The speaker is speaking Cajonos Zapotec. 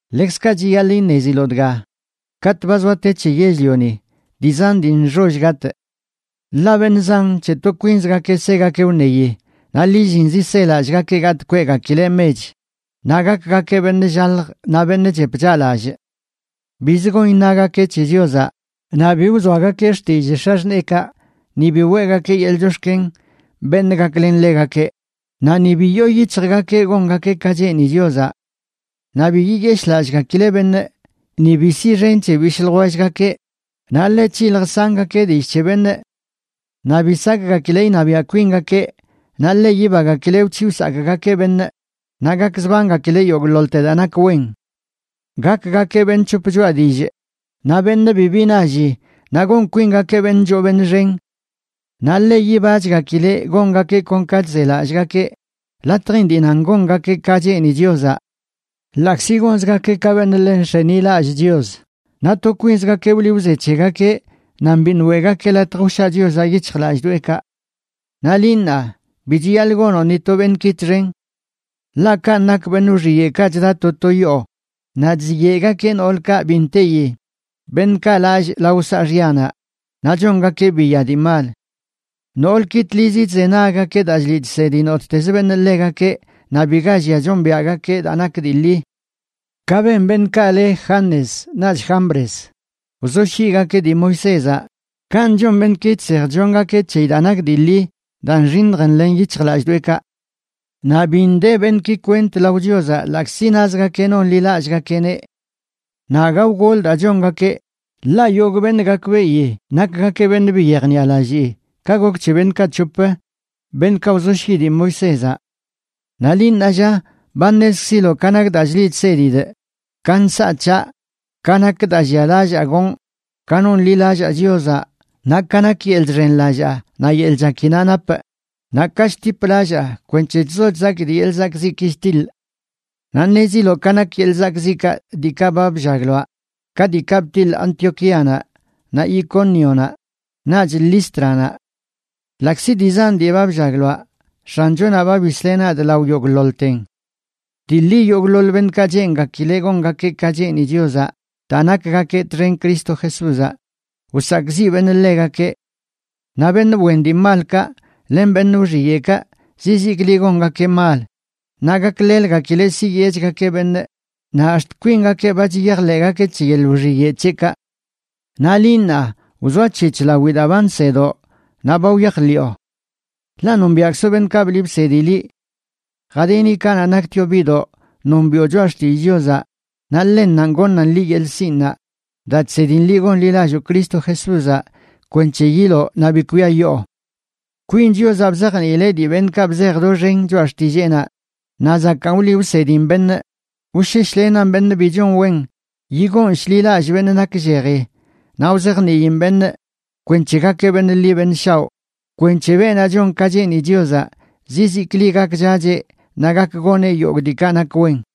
Ḻekzkaꞌ chiyaḻꞌ iṉeziloꞌ dga: katꞌ ba zoa te c̱he yell-lioni, dii zan dii nxoll gatꞌ. Ḻaꞌ beṉꞌ zan c̱he to kwinzgakeꞌ segakeꞌ wṉeyi, naꞌ lillinzi selallꞌgakeꞌ gatꞌ kweꞌgakileꞌ mech, naꞌ gakgakeꞌ beṉꞌ llalj naꞌ beṉꞌ chep chaꞌlallꞌ. Biz gon iṉagakeꞌ c̱he Chiozaꞌ, naꞌ bi wzoagakeꞌ xtillꞌ x̱axṉeekaꞌ, ni bi weꞌgakeꞌ yeḻꞌ chox̱ken beṉꞌ gaklen ḻegakeꞌ, naꞌ ni bi yoo yic̱hjgakeꞌ gongakeꞌ ka cheeni Chiozaꞌ. Naꞌ bi yiyeshꞌlallꞌgakileꞌ beṉꞌ, ni bi siꞌxen c̱he bishꞌ ljwellgakeꞌ, naꞌ ḻe c̱hilj sangakeꞌ dillꞌ c̱he beṉꞌ. Naꞌ bi sakgakileꞌ iṉabiaꞌ kwingakeꞌ, naꞌ ḻe yibagakileꞌ wc̱hiꞌ wsakꞌgakeꞌ beṉꞌ, naꞌ gakzbangakileꞌ yogꞌḻoḻte daa nak wen. Gakgakeꞌ beṉꞌ c̱hop choꞌa dillꞌ, naꞌ beṉꞌ bibi nalli, naꞌ gon kwingakeꞌ beṉꞌ choo beṉꞌ xen. Naꞌ ḻe yibachgakileꞌ gongakeꞌ kon ka chzelallꞌgakeꞌ latjin dii nan gongakeꞌ ka cheeni Chiozaꞌ. Ḻaꞌkzi gonzgakeꞌ ka beṉꞌ ḻe nx̱enilallꞌ Chios, naꞌ to kwinzgakeꞌ wliꞌ wze c̱hegakeꞌ nan biṉꞌ weꞌgakeꞌ latj wshaa Chiozaꞌ yic̱hjlallꞌdoꞌekaꞌ. Naꞌ liꞌ ṉaa, bi chiyaḻꞌ gonoꞌ ni to beṉꞌki txen. Ḻaꞌ kanꞌ nak beṉꞌ wxiyeꞌkaꞌ chda to to yoo, naꞌ chziyeꞌgakeꞌ noolkaꞌ bi nteyi, beṉꞌkaꞌ lallꞌ lao saaxyanaꞌ naꞌ chongakeꞌ biya dii mal. Noolki tlizi chzenaggakeꞌ daa chliꞌ chsedi nottezə beṉꞌ ḻegakeꞌ naꞌ biga llia chombiaꞌgakeꞌ daa nak dii ḻi. Ka ben beṉꞌkaꞌ le Janes naꞌch Jambres, wzoshyiꞌgakeꞌ dii Moisézaꞌ, kanꞌ chon beṉꞌki chsej chllongakeꞌ c̱heyi daa nak dii ḻi daa nxiṉj nḻen yic̱hjlallꞌdoꞌekaꞌ. Naꞌ bi nde beṉꞌki kwent lao Chiozaꞌ ḻaꞌkzi nazgakeꞌ noṉlilallꞌgakeꞌneꞌ. Naꞌ aga wgol daa chongakeꞌ, ḻaꞌ yogꞌ beṉꞌ gakbeꞌi nakgakeꞌ beṉꞌ bi yejniꞌalallii, ka gok c̱he beṉꞌkaꞌ c̱hop, beṉꞌkaꞌ wzoshyiꞌ dii Moisézaꞌ. Naꞌ liꞌ, ṉaa lla, ba ṉezkziloꞌ ka nak daa chliꞌ chsedidꞌ, ka nsaꞌ c̱haꞌ, ka nak daa llialallaa gonꞌ, ka nonḻilallaa Chiozaꞌ, naꞌ ka nak yeḻꞌ chxenlallaa naꞌ yeḻꞌ chakinaꞌ napꞌ, naꞌ ka chtip lallaa kwenc̱he chzo chzakidꞌ yeḻꞌ zakꞌziꞌki chtiḻꞌ. Naꞌ ṉeziloꞌ ka nak yeḻꞌ zakꞌziꞌkaꞌ diikaꞌ ba bllagloaꞌ, ka diikaꞌ btiḻꞌ Antioquíanaꞌ, naꞌ Icónionaꞌ, naꞌch Lístranaꞌ. Ḻaꞌkzi dii zan dii ba bllagloaꞌ, X̱anchonaꞌ ba bisleꞌ nadꞌ lao yogꞌḻoḻten. Dii ḻi, yogꞌḻoḻ beṉꞌkaꞌ cheengakileꞌ gongakeꞌ ka cheeni Chiozaꞌ daa nakgakeꞌ txen Cristo Jesúzaꞌ, wsakꞌziꞌ beṉꞌ ḻegakeꞌ. Naꞌ beṉꞌ wen dii malkaꞌ len beṉꞌ wxiyeꞌkaꞌ, zizikli gongakeꞌ mal, naꞌ gakleləgakileꞌ siyeꞌchgakeꞌ beṉꞌ naꞌ ax̱t kwingakeꞌ ba chiyajḻeꞌgakeꞌ c̱he yeḻꞌ wxiyeꞌ c̱heꞌkaꞌ. Naꞌ liꞌ, ṉaa, wzoac̱hec̱h lawi daa ba nsedoꞌ naꞌ ba wyajḻiꞌo. Ḻaꞌ nombiaꞌkzoꞌ beṉꞌkaꞌ bliꞌ bsedi liꞌ. Jadini kanaꞌ naktioꞌ biꞌdoꞌ nombiꞌo Choꞌa Xtillꞌ Chiozaꞌ, naꞌ ḻennanꞌ goṉan liꞌ yeḻꞌ sinꞌnaꞌ daa chsedin liꞌ gonḻilalloo Cristo Jesúzaꞌ kwenc̱he yiloꞌ naꞌ bi kwiayoo. Kwin Chiozaꞌ bzajniileꞌ dii beṉꞌkaꞌ bzej doxen Choꞌa Xtilleenaꞌ, naꞌ zakaan wliꞌ wsedin beṉꞌ, wsheshlenan beṉꞌ bi chon wen, yigoon shḻi lallꞌ beṉꞌ naklleji, naꞌ wzajniin beṉꞌ kwenc̱he gakeꞌ beṉꞌ ḻi beṉꞌ shaoꞌ, kwenc̱he beenaꞌ chon ka cheeni Chiozaꞌ zizikli gakchacheꞌ naꞌ gak goneꞌ yogꞌ diikaꞌ nak wen.